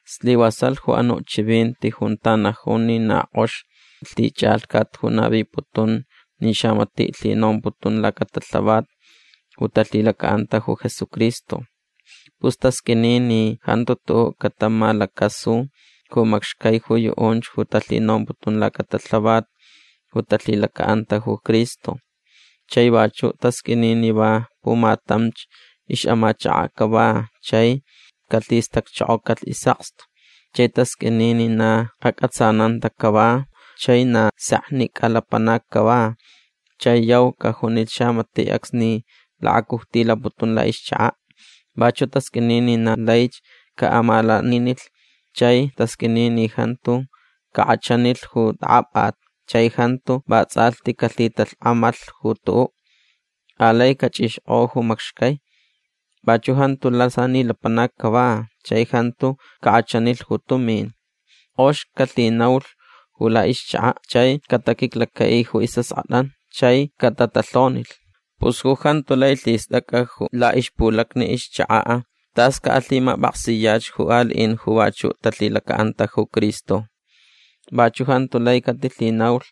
Slivasalh ju anuʼ chivinti junta najun ni na kʼox lhichʼalhcat ju naviputun ni xamatiʼ lhinomputun lacatalhavat ju talhilacaʼanta ju Jesucristo. Pus tasqʼuini ni jantu tuʼuʼ catamalacasu ju macxcai ju yuʼunch ju talhinomputun lacatalhavat ju talhilacaʼanta ju Cristo. Chai vachuʼ tasqʼuini ni va pumatamch ixʼamachakaʼ cava chai calhistacchokocalh isʼakstu. Chai tasqʼuini ni na acʼatsananta cava chai na seknicʼa lapanac cava chai yau cajunilh xamatiʼ acsni lakacujtilaputun laʼixchakaʼ. Vachuʼ tasqʼuini ni na laich caʼamalaninilh. Chai tasqʼuini ni jantu cakʼachanilh ju tʼakʼapʼat chai jantu vatsʼalhti calhitalhkʼamalh ju tuʼuʼ. Alai cachʼixkʼo ju macxcai. Vachuʼ jantu lasani lapanac cava chai jantu cakʼachanilh ju tumin. Kʼox calhinaulh ju laʼixchakaʼ chai cataquiclacaʼi ju isʼaskʼatʼan chai catatalhonilh. Pus ju jantu lai lhistʼacʼa ju laʼixpulacni ixchakaʼ tas caʼalhimapʼaksiyach ju aliʼin ju vachuʼ talhilacaʼanta ju Cristo. Vachuʼ jantu lai catilhinaulh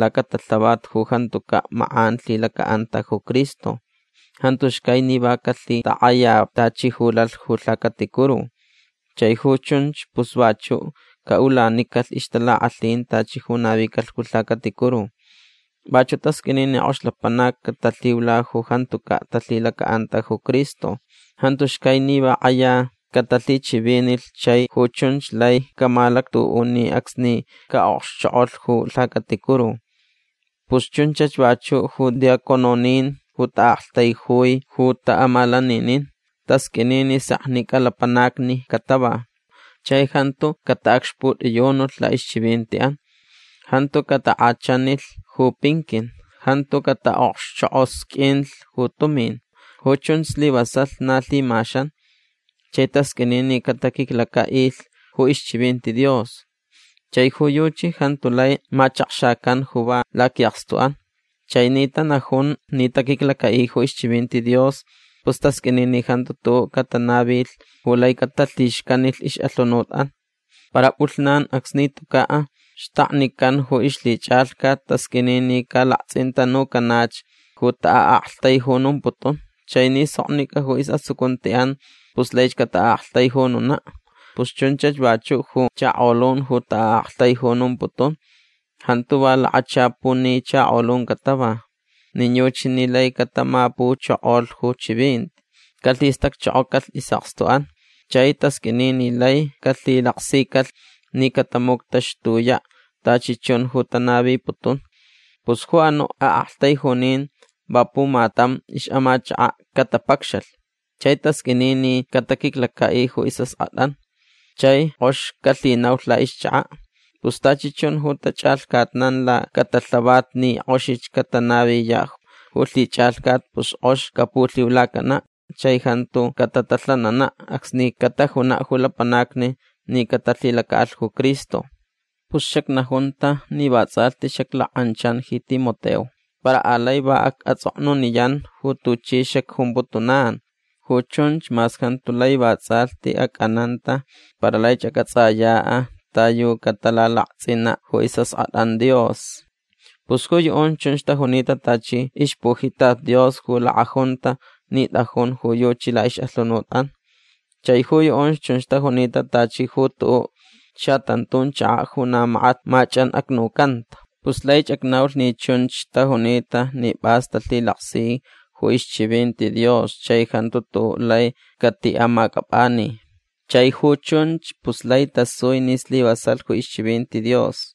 lacatalhavat ju jantucaʼ makʼan lhilacaʼanta ju Cristo. Jantu xcai ni va calhitakʼaya tachi ju lalh ju lhacaticuru. Chai ju chunch pus vachuʼ caʼulanicalh ixtalakʼalhin tachi ju navicalh ju lhacaticuru. Vachuʼ tasqʼuini ni kʼox lapanac catalhiula ju jantucaʼ talhilacaʼanta ju Cristo. Jantu xcai ni va kʼaya catalhichivinilh chai ju chunch lai camalactuʼuni acsni caʼokxchokʼolh ju lhacaticuru. Pus chunchach vachuʼ ju diácononin ju taʼaktaijui ju taʼamalaninin. Tasqʼuini ni seknicʼa lapanacni catava. Chai jantu cataʼacxputʼiyunulh laʼixchivintiʼan. Jantu catakʼachanilh ju pinquin. Jantu cataʼokxchokʼosqʼuinlh ju tumin. Ju chun slivasalh na lhimaxan. Chai tasqʼuini ni cataquiclacaʼilh ju ixchivinti Dios. Chai ju yuchi jantu lai machakxacan ju va laquiʼakstuʼan. Chai ni tanajun ni taquiclacaʼi ju ixchivinti Dios pus tasqʼuini ni jantu tuʼuʼ catanavilh ju lai catalhixcanilh ixʼalhunutʼan. Para pʼulhnan acsni tucaʼ xtaknican ju ixlhichʼalhcat tasqʼuini ni calaktsʼintanucanach ju taʼaʼaktaijunumputun. Chai ni soknicʼa ju isʼatsucuntiʼan pus laich cataʼaʼaktaijununaʼ. Pus chunchach vachuʼ ju chakolun ju taʼaʼaktaijunumputun. Jantu va lakachapuni chakolun catava. Nin yuchi ni lai catamapuchokolh ju chivinti. Calhistacchokocalh isʼakstuʼan chai tasqʼuini ni lai calhilaksicalh ni catamuctaxtuyaʼ tachi chun ju tanaviputun. Pus ju anuʼ aʼaktaijunin va pumatam ixʼamachakaʼ catapacxalh. Chai tasqʼuini ni cataquiclacaʼi ju isʼaskʼatʼan chai kʼox calhinaulh laʼixchakaʼ. Pus tachi chun ju tachʼalhcatnan lacatalhavat ni kʼoxich catanaviyaʼ ju lhichʼalhcat pus kʼox capulhiulacanaʼ chai jantu catatalhananaʼ acsni catajunaʼ ju lapanacni ni catalhilacaʼalh ju Cristo. Pus xacnajunta ni vatsʼalhti xaclakʼanchan ji Timoteo. Para alai va acʼatsʼoknuniyan ju tuchi xacjumputunan. Ju chunch mas jantu lai vatsʼalhti acʼananta para laich acʼatsʼayaʼ ta yu catalalaktsʼinaʼ ju isʼaskʼatʼan Dios. Pus ju yuʼunch chunch tajunita tachi ixpujitat Dios ju lakʼajunta ni tʼajun ju yuchi laʼixʼalhunutʼan. Chai ju yuʼunch chunch tajunita tachi ju tuʼuʼ xatantun chakaʼ ju na makat machʼanʼacnucanta. Pus laich acnaulh ni chunch tajunita ni pʼas talhilaksi ju ixchivinti Dios chai jantu tuʼuʼ lai catiʼamacʼapʼani. Chai ju chunch pus lai tasui ni slivasalh ju ixchivinti Dios.